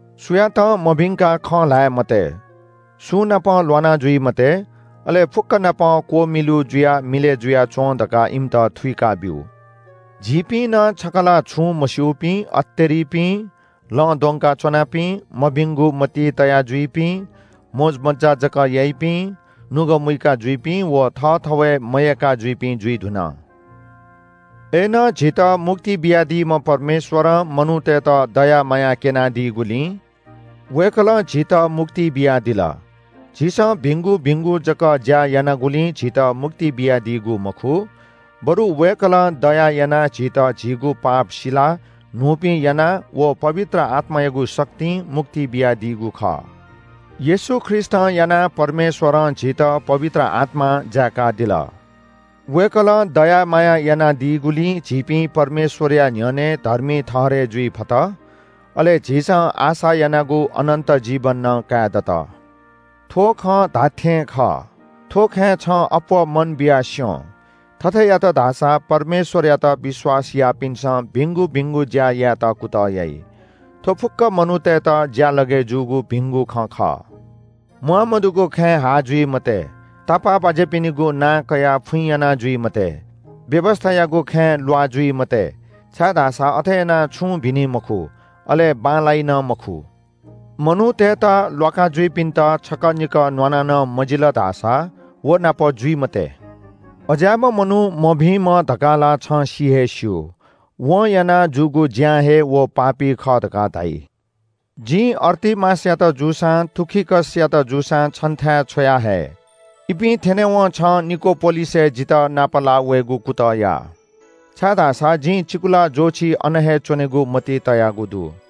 सुयातं मभिंकाः खँ ल्‍हाये मते, सुंनाप ल्‍वाना जुइ मते, अले फुक्‍क नाप क्‍वमिलु जुयाः मिलय् जुयाच्‍वँ धकाः इमित थुइकाब्‍यु। झीपिं नं छकः ला छुं मस्‍यूपिं, अतेरिपिं, लँ द्वंका च्‍वनापिं, मभिंगु मतिइ तया जुइपिं, मोजमज्‍जा जक याइपिं, नुगः मुइका जुइपिं व थःथवय् मयय्‌का जुइपिं जुइ धुन। अय्‌नं झीत मुक्ति बियादीम्‍ह परमेश्‍वरं मनूतय्‌त दया माया क्‍यनादीगुलिं वय्‌कलं झीत मुक्ति बियादिल। झीसं भिंगु भिंगु जक ज्‍या यानागुलिं झीत मुक्ति बियादीगु मखु, बरु वय्‌कलं दया यानाः झीत झीगु पाप सिलाः न्‍हूपिं यानाः व पवित्र आत्‍मायागु शक्तिं मुक्ति बियादीगु खः। येशू ख्रीष्‍टं यानाः परमेश्‍वरं झीत पवित्र आत्‍मां जाय्‌कादिल। वय्‌कलं दया माया यानादीगुलिं झीपिं परमेश्‍वरया न्‍ह्यःने धर्मी ठहरय् जुइ फत, अले झीसं आशा यानागु अनन्‍त जीवन नं काये दत। थ्‍व खँ धात्‍थें खः। थ्‍व खँय् छं अप्‍वः मन बियाः स्‍यँ। थथे यात धाःसा परमेश्‍वरयात विश्‍वास याःपिन्‍सं भिंगु भिंगु ज्‍या यायेत कुतः याइ। थ्‍व फुक्‍क मनूतय्‌त ज्‍यालगय् जूगु भिंगु खँ खः। म्‍वाःमदुगु खँय् हाः जुइ मते, तापाःबाज्‍यापिनिगु नां कयाः फुइँ याना जुइ मते, व्‍यवस्‍थायागु खँय् ल्‍वाः जुइ मते, छाय्‌धाःसा अथे यानाः छुं भिनि मखु, अले बांलाइ नं मखु। मनूतय्‌त ल्‍वाका जुइपिन्‍त छकः निकः न्‍वाना नं मजिल धाःसा व नाप जुइ मते। अज्‍याःम्‍ह मनू मभिंम्‍ह धकाः ला छं सि हे स्‍यू। वं याना जूगु ज्‍यां हे व पापी खः धकाः धाइ। जिं अर्तिमासयात जूसां तुखिकसयात जूसां छन्‍थाय् छ्वयाहये। इपिं थ्‍यनेवं छं निकोपोलिसय् जितः नापलाः वयेगु कुतः या, छाय्‌धाःसा जिं चिकुला ज्‍वःछि अन हे च्‍वनेगु मतिइ तयागु दु।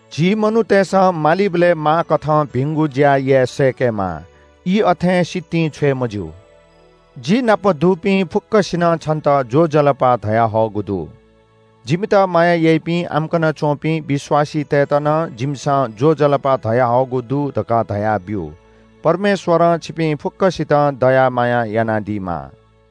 झी मनूतय्‌सं मालीबलय् माःकथं भिंगु ज्‍या याये सय्‌केमाः। ई अथें सितिं छ्वये मज्‍यू। जि नाप दुपिं फुक्‍कसिनं छन्‍त ज्‍वजलपा धयाहःगु दु। जिमित माया याइपिं आम्‍कन च्‍वंपिं विश्‍वासीतय्‌त नं जिमिसं ज्‍वजलपा धयाहःगु दु धकाः धयाब्‍यु। परमेश्‍वरं छिपिं फुक्‍कसितं दया माया यानादीमा।